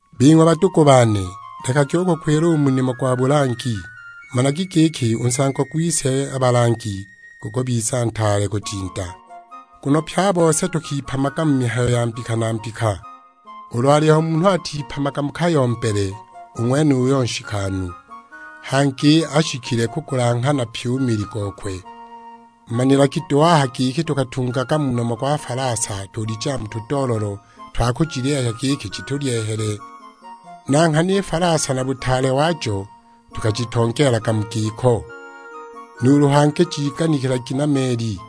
Bing'we badugu bane, lekagi u kukwila u mu nimo gwa bulangi, managi giki u nsango gwise a balangi gukubiza ntaale kutinda. Nguno pye a bose tukipamaga mu mihayo ya mbika na mbika; ulu aliho munhu atipamaga mu kayombele, u ng'wenuyo nshikanu; hangi ashikile kugulanghana pyi u mili gokwe. Manilagi duhu a ha giki tukatungaga mu nomo gwa falasa tulijamu tudoololo twa kujilyehya giki jitulyehele; na nghana i falasa na butaale wajo tukajitongeelaga mu giko. Nuulu hangi jiganikilagi na meli,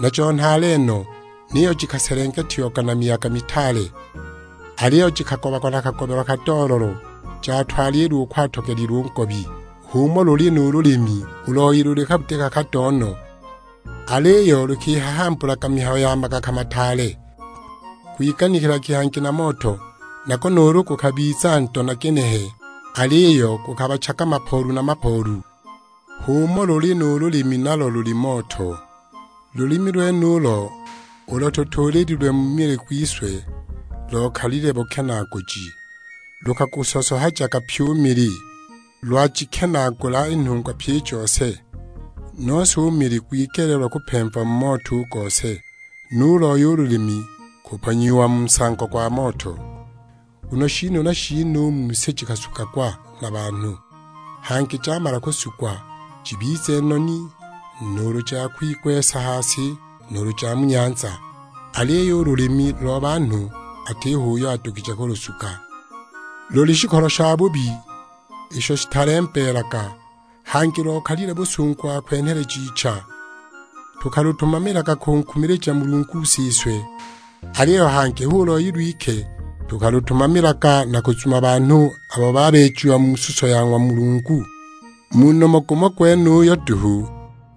najo nhaale no; niyo jikaselengetiagwa na miyaga mitaale. Aliyo jikagobagwa na kagobelo kadoololo, jatwaliilwa uko atogelilwe u ngobi. H'umo luli nu lulimi; u loi luli kabudika kado no, aliyo lukihahambulaga mihayo ya magaka mataale! Gwiganikilagi hangi na moto, nago nuulu gukabiza ndo na ginehe, aliyo gukabachaga mapoolu na mapoolu! H'umo luli nu lulimi, nalo luli moto. U lulimi lwenulo, ulo tutuulililwe mu mili gwise, lokalile bukenaaguji. Lukagusosohajaga pyi u mili, lwajikenaagula i nhungwa pyi i jose. Nose u mili gwigeleelwa kupemva mu moto u gose, nu loi u lulimi kuponyiwa mu nsango gwa moto! Nguno shiinu na shiinu u mu si jikasugagwa na banhu, hangi jamala kusugwa: jibize noni, nuulu ja kwigwesa ha si, nuulu ja mu nyanza. Aliyo u lulimi lo banhu atiho uyo adugije kulusuga, luli shikolo shabubi isho shitalembeelaga, hangi lokalile busungu wa kwenheleja icha! Tukalutumamilaga kunkumilija Mulungu Siswe, aliyo hangi hu loi lwike tukalutumamilaga na kuzuma banhu, abo babeejiwe mu suso ya ng'wa Mulungu! Mu nomo gumo gwenuyo duhu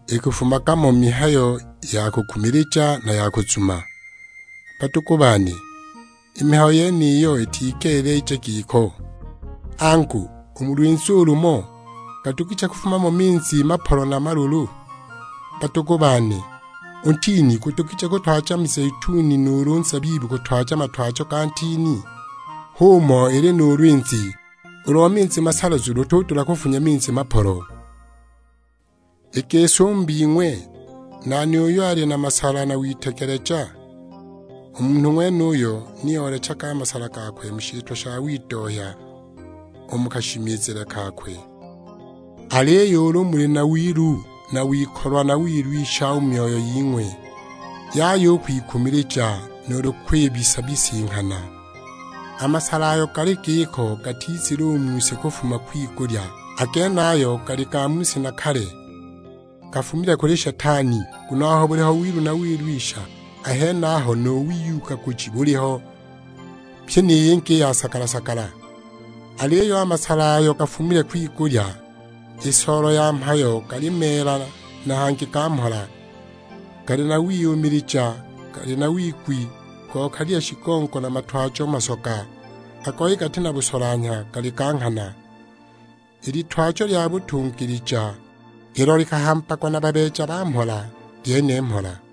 ikafumaga mo mihayo ya kukumilija na ya kuzuma! Badugu bane, i mihayo yeniyo itigelile ije giko! Angu, u mu lwinzi u lumo gadugije kufuma mo minzi mapolo na malulu? Badugu bane, u ntini gudugije kutwaja mizeituni, nuulu u nzabibu kutwaja matwajo ga ntini? H'umo ili nu lwinzi, u lo minzi masalazu lutudula kufunya minzi mapolo! I gisi u mu bing'we nani uyo ali na masala na witegeleja? U munhu ng'wenuyo ni oolechage a masala gakwe mu shitwa sha widohya u mu kashimizile kakwe. Aliyo ulu muli na wilu na wikolwa na wilwisha u mu myoyo ying'we, yaya u kwikumilija nuulu kwibisa-bisa i nghana! A masala ayo gali giko gatizile u mu si kufuma kwigulya, a genayo gali ga mu si na kale; gafumile kuli Shetani. Nguno aho buliho wilu na wilwisha, a henaho nu wiyugaguji buliho, pyi ni yingi i ya sagala-sagala. Aliyo a masala ayo gafumile kwigulya, i soolo ya mhayo gali meela na hangi ga mhola. Gali na wiyumilija, gali na wigwi, gokalile shigongo na matwajo masoga; a goi gati na busolanhya, gali ga nghana. I litwajo lya butungilija, ilo likahambagwa na babeeja ba mhola, lyene mhola.